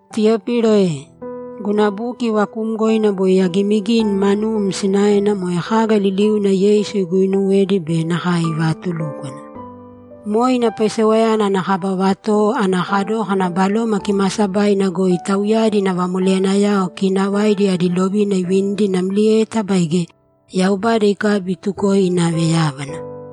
Tiyopilo e, Guna buki vakuumgoina boi agiimigini manum sinaena moe kaga liliuna Yeisu iguinuwedi be nakae ivatulúkwana. Moe ina paisewayana ana kaba vatowo ana kadókana Baloma Kimaasabaina goi tauyadi ina vamoleyanayao kiinavaidi adi lovina ivinidi namlieta baige Yaubada ikabi itukoe inave yábana.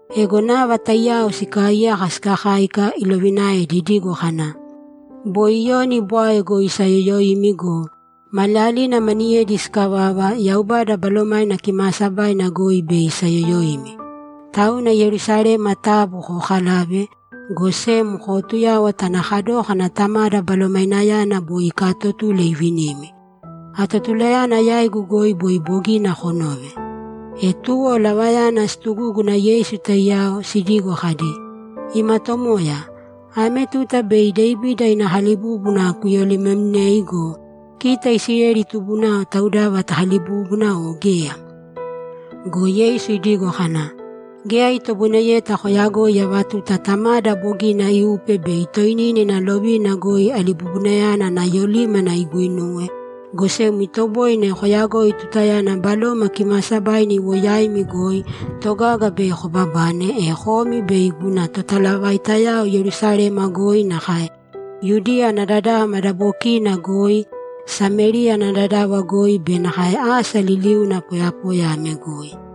Ego nava taiyao sikaaiyaka sikakáika, ilovinaedi idigo kana, ‘Boi Iyoni bwae goi isayoyoimi go, maliyalina maniyedi sikavava, Yaubada Balomaina Kimaasabaina goi bei isayoyoimi. Tauna Yerusalema taabu kookalāve, go sem kootuyāwata ana kadókana Tamada Balomainayana boi ikaatotule ivinimi. Atotulayana yaigu goi boi bogina konove.’ E tuwo lavayana situgúguna Yeisu taiyao, sidigo kadi, ‘Ima Tomoya, ame tuta bei Devida ina kalibúbuna kuyolimemnei go, kita Isileli tubunao taudava takalibubuda o geya?’ Go Yeisu idigo kana, ‘Geya itoboineyeta koyagoi ava tuta Tamada bogina iupe bei toinina ina lovina goi alibubunayana ana yolímana iguinuwe, go sem itoboine koyagoi tutayana Baloma Kimaasabaina iwo yaimi goi, togaga bei kobabane, e komi bei guna totalavaitayao Yerusalema goi nakae Yudiya ana dadava madabokiina goi, Samériya ana dadava goi be nakae asa liliuna poyapoya ame goi.’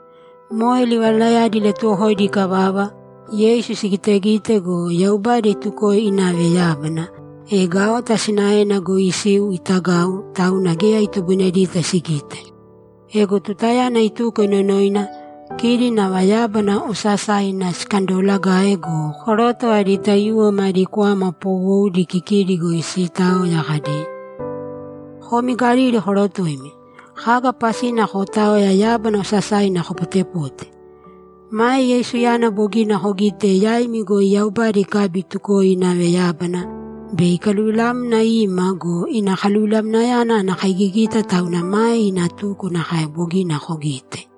Moe livalayadi ilatuwokoidi ikavava, Yeisu sigitegite go, Yaubada itukoe inave yábana, e gaota sinaena goi isiu itagau, tauna geya itoboinedita sigite. Ego tutayana ituko inonoina, kidi nava yábana osasaina sikandoolagae go, koroto adi taiyuwo madi kwama poowoudi kikidi goi siitaoya kadi, ‘Komi Galili korotoimi, kaga pasina kootaoya yábana osasaina kopotepote? Mae Yeisuyana bogina kogite yaimi goi Yaubada ikabi itukoe inave yábana, bei ikaluvilamna ima go, ina kaluvilamnayana ana kaigigita tauna mae ina tuko nakae bogina kogite.’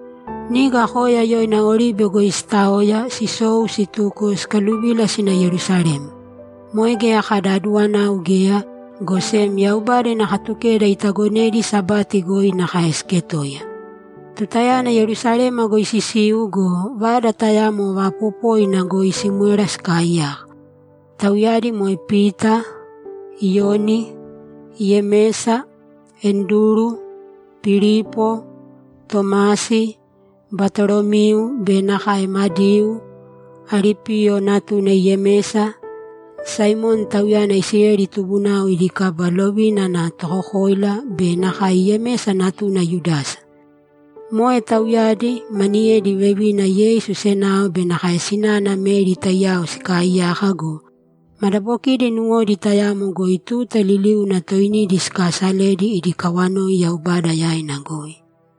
Niga koya yoina Oribe goi sitaoya, sisou situko sikaluvila sina Yerusalema. Moe geya kada aduwanau geya, go sem Yaubada ina Katukeda itagonedi Sabati goi nakae siketoiya. Tutayana Yerusalema goi sisiu go, vada tayamo vaapopoina goi simwera sikaaiyaka. Tauyadi moe Pita, Iyoni, Yemesa, Anduru, Pilipo, Tomasi, Batolomiu be nakae Madiu, Alipiyo natuna Yemesa, Saimoni (tauyana Isileli tubunao idi kaba lovina ana tokokoila) be nakae Yemesa natuna Yudasa. Moe tauyadi, maniyedi vevina, Yeisu senao be nakae sinana Meri taiyao sikaaiyaka go, madabokidi nuwodi tayamo goi tuta liliuna toinidi sikaasaledi idi kawanoi Yaubada yaina goi.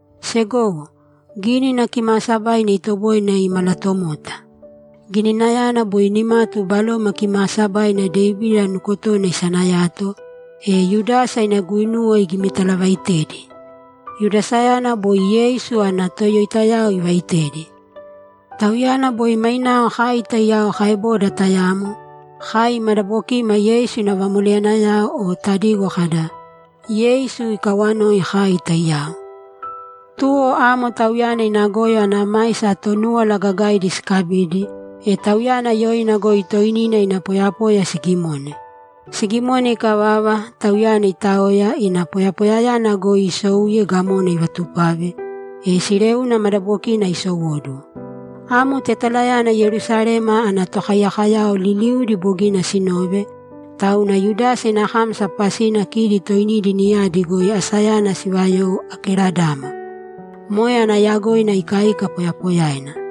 ‘Segowo, Gínina Kimaasabaina itoboine imalatomota. Gininayana boi nimatu Baloma Kimaasabaina Devida nukotona isanayato, e Yudasa ina guinuwa igimitalavaitedi. Yudasayana boi Yeisu ana toyoitayao ivaitedi. Tauyana boi mainao kai taiyao kaeboda tayamo; kai madabokima Yeisu ina vamoleyanayao o tadigo kada, “Yeisu ikawoi kai taiyao.” Tuwo amo tauyana ina goyo ana maisa Tonúwala Gagaidi sikabidi, e tauyana yoina goi toinina ina poyapoya sigimone. Sigimone ikavava, tauyana itaoya, ina poyapoyayana goi isouye gamona ivatupave, e sileuna madabokina isowóduwo. Amo tetalayana Yerusalema ana tokaiyakoyao liliudi bogina sinove, tauna Yudasa ina kámasa pasina kidi toinidi niyadi goi asayana sivayou Akeladama.’ Moe ana yagoina ikaika poyapoyaina.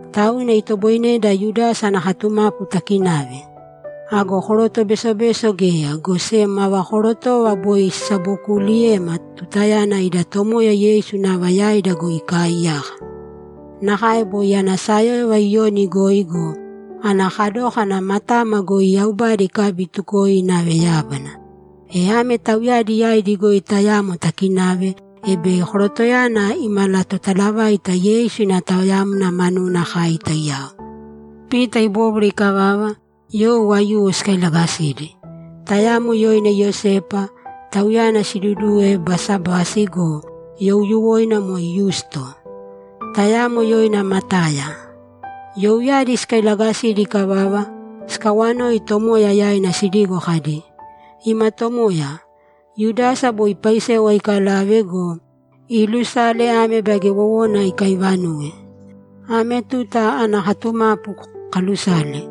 Tauna itoboineda Yudasa ana katumapu takinave. Ago koroto besobeso geya, go sem ava korotova boi sisabokuuliyema tutayana ida Tomoya Yeisu nava yaida goi ikaaiyaka. Nakae boi ana sayóyova Iyoni goi go, ana kadókana matama goi Yaubada ikabi itukoe inave yábana. E ame tauyadi yaidi goi tayamo takinave, e bei korotoyana imalatotalavaita Yeisu ina taoyamna manuna kai taiyao.’ Pita ibóbwara ikavava, you aiyuwo sikailagasidi: Tayamo yoina Iyosepa, tauyana siduduwe Basabasi go, youyuwoina moe Yusto. Tayamo yoina Mataya. Youyadi sikailagasidi ikavava, sikawanoi Tomoya yaina sidigo kadi, ‘Ima Tomoya, Yudasa boi paisewa ikalave go, iilusale ame baige wowona ikaivanuwe. Ame tuta ana katumapu kaalusale.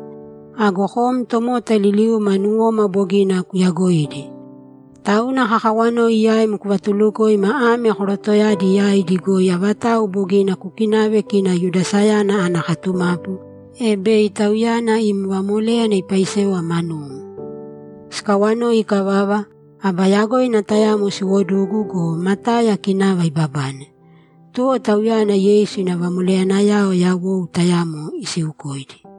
Ago kom tomota liliuma nuwoma bogina kuyagoidi. Tauna kakawanoi yaim kuvatulukoima ame korotoyadi yaidi goi avatau bogina kukinave kina Yudasayana ana katumapu, e bei tauyana im vamoléyana ipaisewa manum.’ Sikawanoi ikavava, aba yagoina tayamo siwodugu go, Mataya kinava ibabane. Tuwo tauyana Yeisu ina vamoleyanayao yawou tayamo isiukoidi.